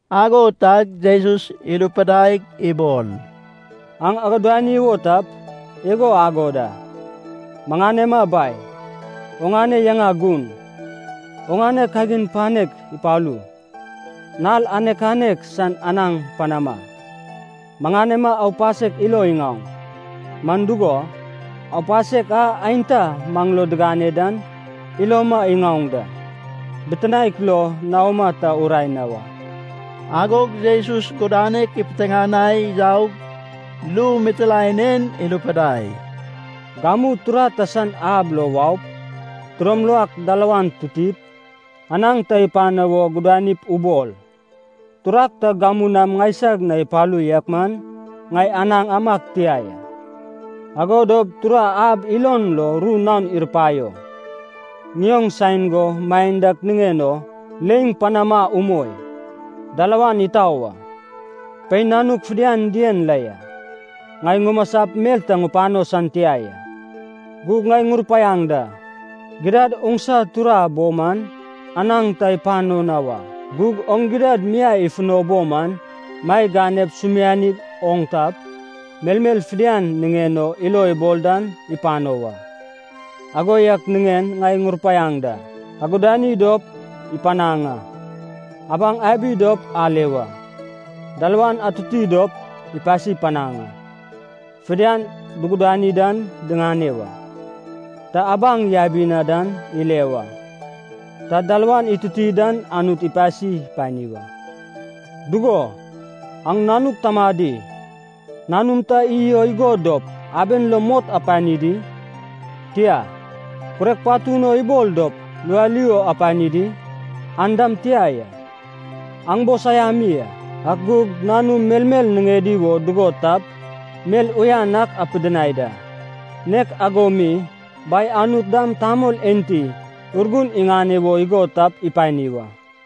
Ago tag Jesus irupidaig ibol, “Aŋ agudani wo tap, igo agod a: ‘Maŋanema Bai, oŋane yaŋa gun. Oŋane kagin panek ipalu. Nal anek anek san anaŋ panama. Maŋanema aupasek ilo iŋaoŋ. Man dugo, aupasek a aenta maŋ lo digane dan iloma iŋaoŋ da. Bitinaek lo naoma ta urae na wa.’” Agog Jesus gudanek ipiteŋanai yaug, ru mitilaen en irupidai, “Gamu tura ta san ab lo waup, tidom lak dalawan tutip, anaŋ ta ipano wo gudanip ubol. ‘Turag ta gamu nam ŋaisag na ipalu yak man ŋai anaŋ amag tia ya.’ “Ago dop tura ab ilon lo ru naon irupaio, ‘Ŋioŋ saen go maen dak niŋen o leiŋ panama umoi. Dalawan itau a, pein nanuk fidian dien la ya. Ŋai ŋumasap mel ta ŋupano san tia ya.’ Gug ŋai ŋurupaiaŋ da, gidad, oŋsa tura bo man anaŋ ta ipano na wa. Gug oŋ gidad miai ifuno bo man maeg ganep sumiani oŋ tap, melmel fidian niŋen o ilo ibol dan ipano wa.” “Ago yak niŋen ŋai ŋurupaiaŋ da: Agudani dop, ipanaŋ a. Abaŋ abi dop, ale wa. Dalawan atuti dop, ipasi panaŋ a. Fidian dugudani dan diŋane wa. Ta abaŋ yabi dan ile wa. Ta dalawan ituti dan Anut ipasi pani wa.” “Dugo, aŋ nanuk tamadi, nanum ta iy o igod dop, aben lo mot apani di? Tia. Kurek patun o ibol dop lualiu apani di? An dam tia ya. Aŋ bo saiami a, ak gug nanum melmel niŋedi wo dugod tap, mel uyan ak apidinai da. Nek ago mi Bai Anut dam tamol enti Urgun iŋane wo igod tap ipani wa.”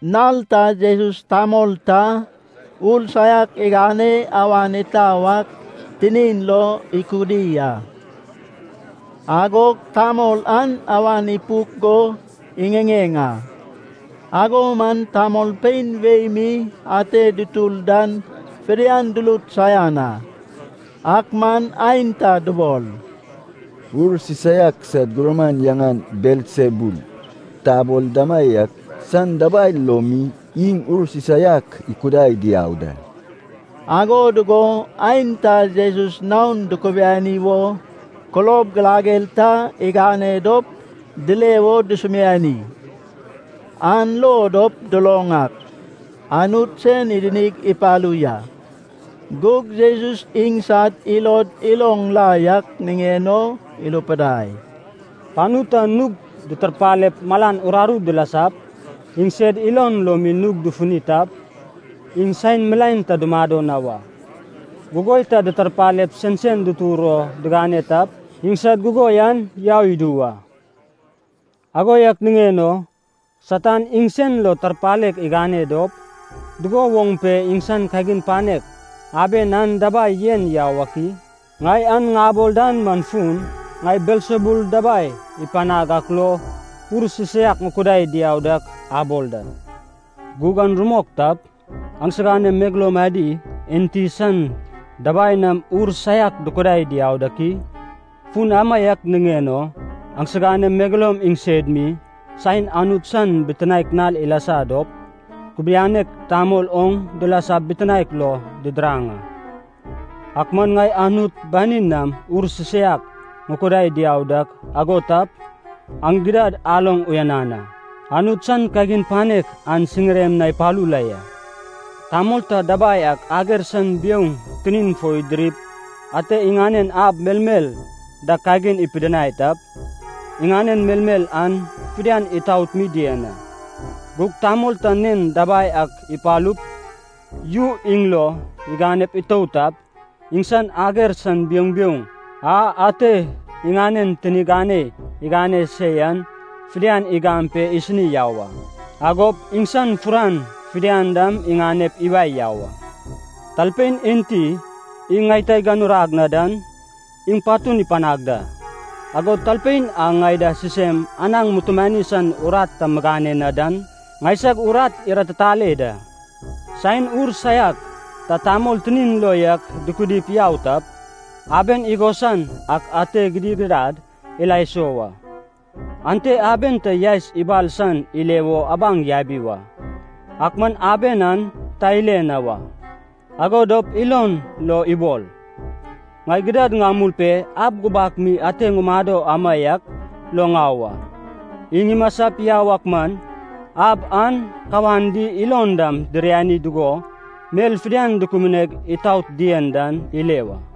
Nal ta Jesus tamol ta, ur saiak igane awan itau ak tinin lo ikudi a. Agog tamol an awan ipuk go iŋiŋeŋ a. Ago man tamolpein wei mi ate dutur dan fidian durut saian a. Ak man aenta dubol, “Ur sisaiak sad gurman yaŋan Belsebul tabol damaiak san dabai lo mi iŋ ur sisaiak ikudai diau da.” Ago dugo aenta Jesus naon dukubiani wo kulob girager ta igane dop, dile wo dusumiani. An lo dop duloŋ ak, Anut sen idinig ipalu ya. Gug Jesus iŋsad ilod iloŋ la yak niŋen o irupidai, “Panu ta nug ditarpalep malan uraru dilasap, iŋsed ilod lo mi nug dufuni tap, iŋ saen milaen ta dumado na wa. Gugoi ta ditarpalep sensen dutur o digane tap, iŋsad gugoi an yau idu wa. Ago yak niŋen o Satan iŋsen lo tarpalek igane dop, dugo woŋ pe iŋsan kagin panek aben an dabai yen yau ak i? Ŋai an ŋabol dan man fun, ŋai Belsebul dabai ipanag ak lo ur sisaiak ŋukudai diau dak abol da. Gug an rumok tap, aŋsiganem megeloum adi, enti san dabai nam ur saiak dukudai diau dak i? Fun amaiak niŋen o aŋsiganem megeloum iŋsed mi, saen Anut san bitinaek nal ilasa dop, kubianek tamol oŋ dilasap bitinaek lo didiraŋ a. Ak man ŋai Anut banin nam ur sisaiak ŋukudai diau dak ago tap, aŋ gidad aloŋ uyanan a, Anut san kagin panek an siŋirem na ipalu la ya.” “Tamol ta dabai ak ager san biouŋ tinin fo idirip ate iŋanen ab melmel da kagin ipidinai tap, iŋanen melmel an fidian itaot mi dien a. Gug tamol ta nen dabai ak ipalup, yu iŋ lo iganep itout tap, iŋsan ager san biouŋ biouŋ a ate iŋanen tini ganei igane se yan fidian igam pe isini yau a, agop iŋsan furan fidian dam iŋanep iwae yau a. “Talpein enti iŋ ŋai ta iganurag na dan, iŋ patun ipanag da. Agod talpein a ŋai da sisem anaŋ mutumani san urat ta migane na dan, ŋaisag urat iratitale da.” “Saen ur saiak ta tamol tinin lo yak dukudip yau tap, aben igosan ak ate gidigidad ila iso wa. Ante aben ta yaes ibal san ile wo abaŋ yabi wa, ak man aben an ta ile na wa. Ago dop ilon lo ibol, ‘Ŋai gidad ŋamul pe ab gubak mi ate ŋumado amaiak lo ŋau a.’ Iŋ imasap yau ak man, ab an kawan di ilon dam diriani dugo mel fidian dukubuneg itaot dien dan ile wa.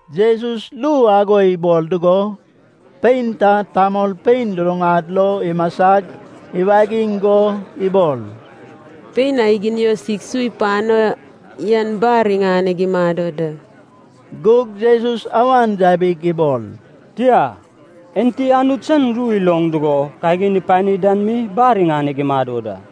Jesus ru ago ibol dugo, pein ta tamolpein luluŋad lo imasag iwagiŋ go ibol, “Pein a iginiosig su ipano yan bar iŋaneg imado da.” Gug Jesus awan yabig ibol, “Tia. Enti Anut san ru iloŋ dugo kagin ipani dan mi bar iŋaneg imado da.”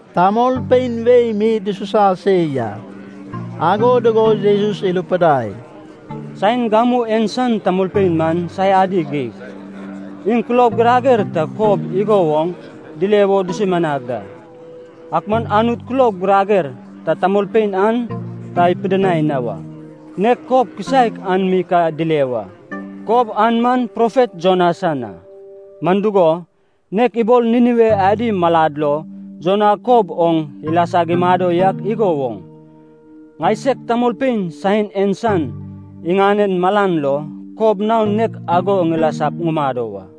Tamolpein wei mi dususa se ya, ago dugo Jesus irupidai, “Saen gamu en san tamolpein man saiadi geig. Iŋ kulob girager ta kob igo woŋ dile wo dusumianag da. Ak man Anut kulob girager ta tamolpein an ta ipidinai na wa, nek kob kisaek an mi ka dile wa, kob an man profet Jona san a. Man dugo, nek ibol Ninive adi malad lo Jona kob oŋ ilasag imado yak igo woŋ, ŋaiseg tamolpein saen en san iŋanen malan lo kob naon nek ago ŋilasap ŋumado wa.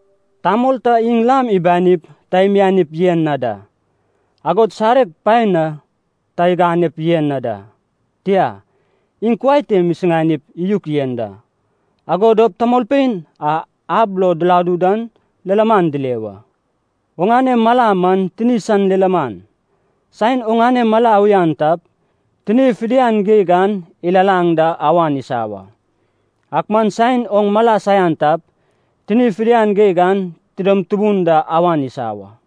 Tamol ta iŋ lam ibanip ta imianip yen na da. Agod sareg paen na ta iganep yen na da. Tia, iŋ kuai te isuŋanip iyuk yen da. Ago dop tamolpein a ab lo diladu dan lilaman dile wa. Oŋane mala man tini san lilaman. Saen oŋane mala uyan tap, tini fidian geig an ilalaŋ da awan isa wa. Ak man saen oŋ mala saian tap, tini fidian geig an tidom tubun da awan isa wa.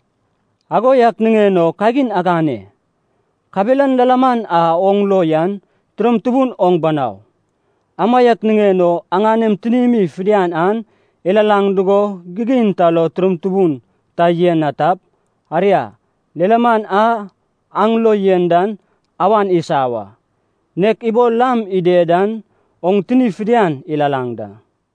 Ago yak niŋen o kagin agane. Kabelan lilaman a oŋ lo yan tidom tubun oŋ banau. Amaiak niŋen o aŋanem tinim fidian an ilalaŋ dugo gigin ta lo tidom tubun ta yen na tap, aria, lilaman a aŋ lo yen dan awan isa wa, nek ibol lam ided dan oŋ tini fidian ilalaŋ da.”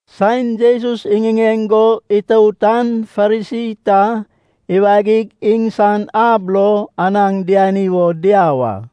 Saen Jesus iŋiŋeŋ go itout an Farisi ta iwagig iŋsan ab lo anaŋ diani wo diau a.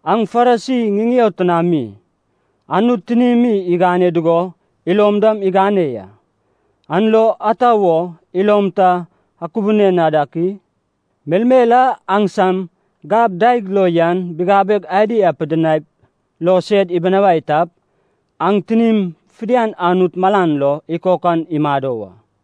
Aŋ Farisi ŋiŋeo tinami. Anut tinim igane dugo ilom dam igane ya. An lo ata wo ilom ta akubune na dak i? Melmel a aŋsam gab daeg lo yan bigabeg adi apidinaip lo sed ibunawai tap, aŋ tinim fidian Anut malan lo ikokan imado wa.”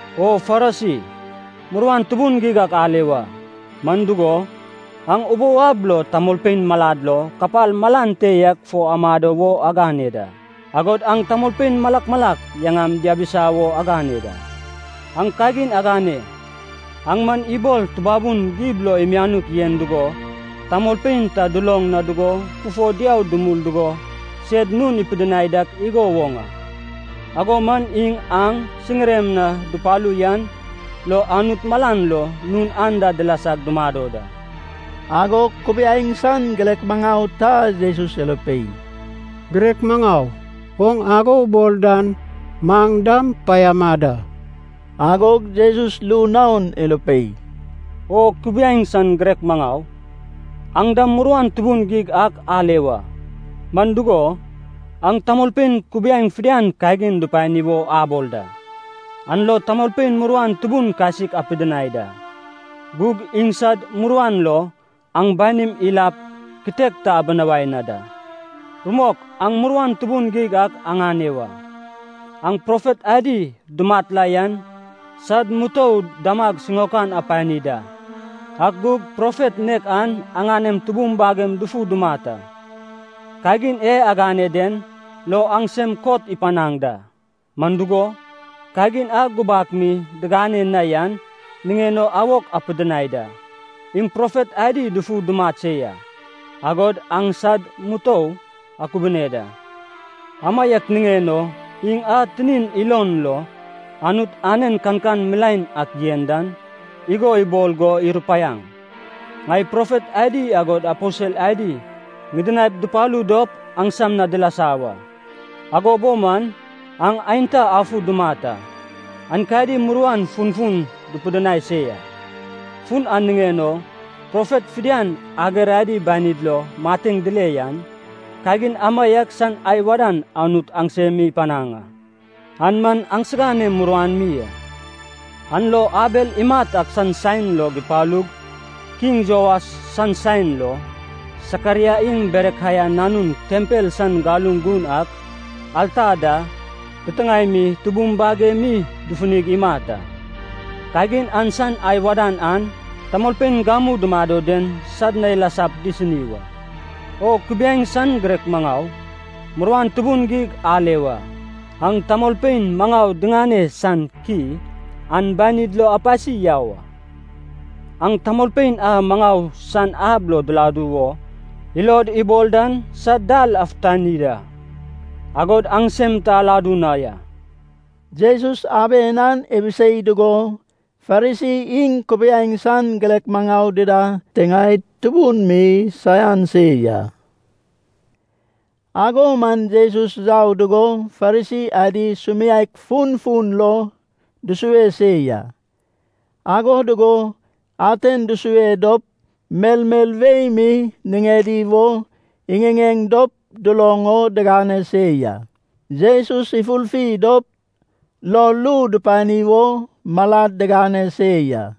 “O Farisi, muruan tubun geig ak ale wa! Man dugo, aŋ ubou ab lo tamolpein malad lo kapal malan te yak fo amado wo agane da. Agod aŋ tamolpein malak malak yaŋam diabisa wo agane da.” “Aŋ kagin agane! Aŋ man ibol tubabun gib lo imianuk yen dugo tamolpein ta duloŋ na dugo fufo diau dumul dugo sed nun ipidinai dak igo woŋ a, ago man iŋ aŋ siŋirem na dupalu yan lo Anut malan lo nun anda dilasag dumado da.” Agog kubiaeŋ san girek maŋau ta Jesus irupei, “Girek maŋau, oŋ ago ubol dan maŋ dam paiama da.” Agog Jesus ru naon irupei, “O kubiaeŋ san girek maŋau, aŋ dam muruan tubun geig ak ale wa! Man dugo, aŋ tamolpein kubiaeŋ fidian kagin dupani wo abol da. An lo tamolpein muruan tubun kasik apidinai da. Gug iŋsad muruan lo aŋ banim ilap kitek ta abinawai na da.” “Rumok aŋ muruan tubun geig ak aŋane wa! Aŋ profet adi dumat la yan sad mutou damag siŋaokan apani da, ak gug profet nek an aŋanem tubum bagem dufu dumat a. Kagin e agane den lo aŋsem kot ipanaŋ da, man dugo, kagin a gubak mi digane na yan niŋen o awok apidinai da. Iŋ profet adi dufu dumat se ya, agod aŋ sad mutou akubune da. Amaiak niŋen o Iŋ a tinin ilon lo Anut anen kankan milaen ak yen dan, igo ibol go irupaiaŋ, ŋai profet adi agod aposel adi ŋidinaip dupalu dop aŋsam na dilasa wa. Ago bo man aŋ aenta afu dumat a, aenkadi muruan funfun dupidinai se ya. Fun an niŋen o, profet fidian ager adi banid lo mateŋ dile yan, kagin amaiak san ai wadan Anut aŋsem mi ipanaŋ a. An man aŋsiganem muruan mi a. An lo Abel imat ak san saen log ipalug kiŋ Joas san saen lo, Sakaraia iŋ Berekaia nanun tempel san galuŋ gun ak, alta da titiŋae mi tubum bagemi dufunig imat a, kagin an san ai wadan an tamolpein gamu dumado den sad na ilasap disini wa.” “O kubiaeŋ san girek maŋau, muruan tubun geig ale wa! Aŋ tamolpein maŋau diŋane san ki an banid lo apasi yau a. Aŋ tamolpein a maŋau san ab lo diladu wo ilod ibol dan sad dal afutani da, agod aŋsem ta aladu na ya.” Jesus aben an ibisei dugo Farisi iŋ kubiaeŋ san girek maŋau dida tiŋaed tubun mi saian se ya. Ago man Jesus yau dugo Farisi adi sumiaek funfun lo dusue se ya, ago dugo aten dusue dop melmel wei mi niŋedi wo iŋiŋeŋ dop duloŋ o digane se ya. Jesus ifurfi dop lo ru dupani wo malad digane se ya.